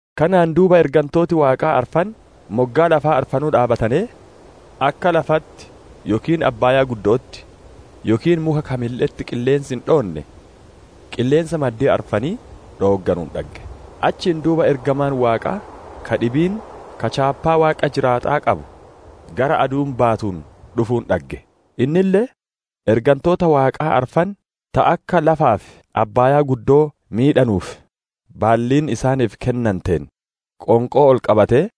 Kanaan duuba ergantooti Waaqaa arfan, moggaa lafaa arfanuu dhaabbatanee, akka lafatti yookiin abbaaya'atti, yookiin muka kamille'etti qilleensi hin dhoonne, qilleensa maddii arfanii dhoogganuun dhagge. Achiin duuba ergamaan Waaqaa ka dhibiin ka chaappaa Waaqa jiraata'aa qabu gara aduun baatuun dhufuun dhagge; innille, ergantoota Waaqaa arfan, ta akka lafaa fi abbaayaa miidhanuuf baalliin isaanii kennanteen, qoonqoo ol qabatee,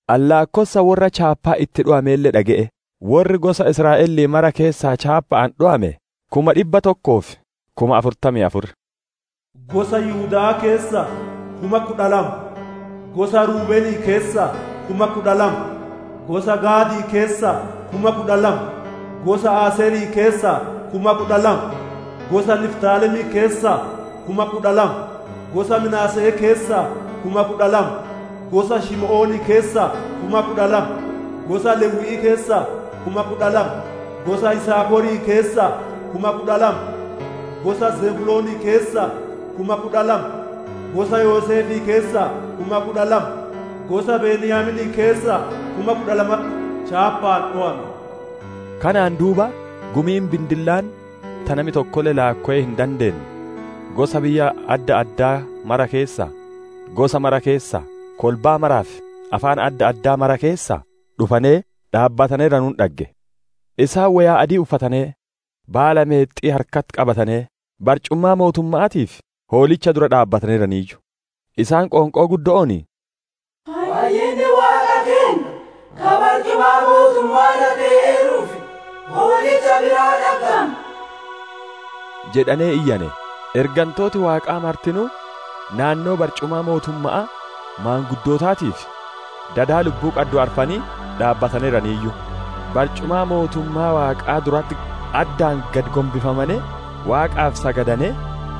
Ani laakkossa worra chaappaan itti dhowameelle dhage'e; worri gosa Israa'elii mara keessaa chaappa'aan dhowame kuma dhibba tokkoo fi kuma afurtamii afur. Gosa Yihudaa keessaa kuma kudha lama, gosa Ruubenii keessaa kuma kudha lama, gosa Gaadii keessaa kuma kudha lama, gosa Aseerii keessaa kuma kudha lama, gosa Niftaalemii keessaa kuma kudha lama, gosa Minaase'ee keessaa kuma kudha lama, gosa Shimi'oonii keessaa kuma kudha lama, gosa Lewwi'ii keessaa kuma kudha lama, gosa Yisaakorii keessaa kuma kudha lama, gosa Zebuloonii keessaa kuma kudha lama, gosa Yoseef keessaa kuma kudha lama, gosa Beniyaaminii keessaa kuma kudha lamatti chaappaan dhowame. Kanaan duuba gumiin bindillaan ta nami tokkolle laakkowee hin dandeenne gosa biyya adda addaa mara keessaa, gosa mara keessaa, kolbaa maraa fi afaan adda addaa mara keessaa dhufane dhaabbataneeranuun dhagge; isaan woyaa adii uffatanee, baala meexxi'ii harkatti qabatanee, barcumaa mootumma'aatii fi Hoolichaa dura dhaabbataneeraniiyyu. Isaan qoonqoo guddo'oon, «Fayyinni Waaqa keenna ka barcumaa mootumma'aa irra tee'eeruu fi Hoolicha biraa dhaggama!» jedhanee iyyane. Ergantooti Waaqaa martinuu naannoo barcumaa mootumma'aa, maanguddootii fi dadi lubbuu qaddu arfan dhaabbataneeraniiyyu; barcumaa mootummaa Waaqaa duratti addaan gad gombifamanee Waaqaaf sagadanee,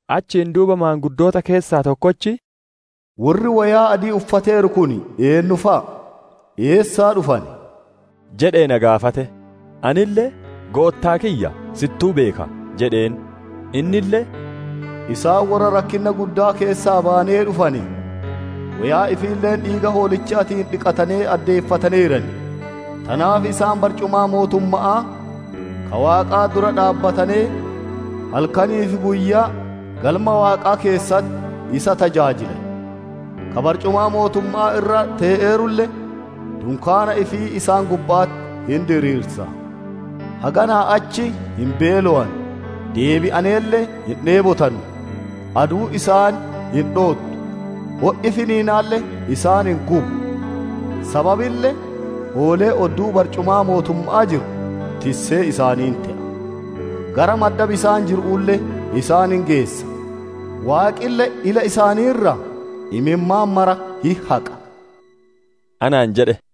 Achiin duuba maanguddoota keessaa tokkochi, «Worri woyaa adii uffateeru kun eennu fa'a? Eessaa dhufane?» jedhee na gaafate. Anille, «Goottaa kiyya, si'ittuu beeka» jedheen. Innille, «Isaan worra rakkinna guddaa keessaa bayanee dhufane; woyaa ifiille dhiiga Hoolichaatiin dhiqatanee addeeffataneeran. Tanaaf isaan barcumaa mootumma'aa ka Waaqaa dura dhaabbatanee, halkanii fi guyyaa Galma Waaqaa keessatti isa tajaajilan; ka barcumaa mootumma'aa irra tee'eerulle dunkaanii ifii isaan gubba'atti hin diriirsa. Haganaa achi hin beelowanu; deebi'aneelle hin dheebotanu, aduun isaan hin dhoottu, o'i finiinaalle isaan hin gubu. Sababille, Hoolichi odduu barcumaa mootumma'aa jiru tissee isaanii hin te'a; gara madda bisaan jiru'uulle isaan hin geessa. Waaqille ila isaanii irraa imimmaan mara hin haqa» anaan jedhe.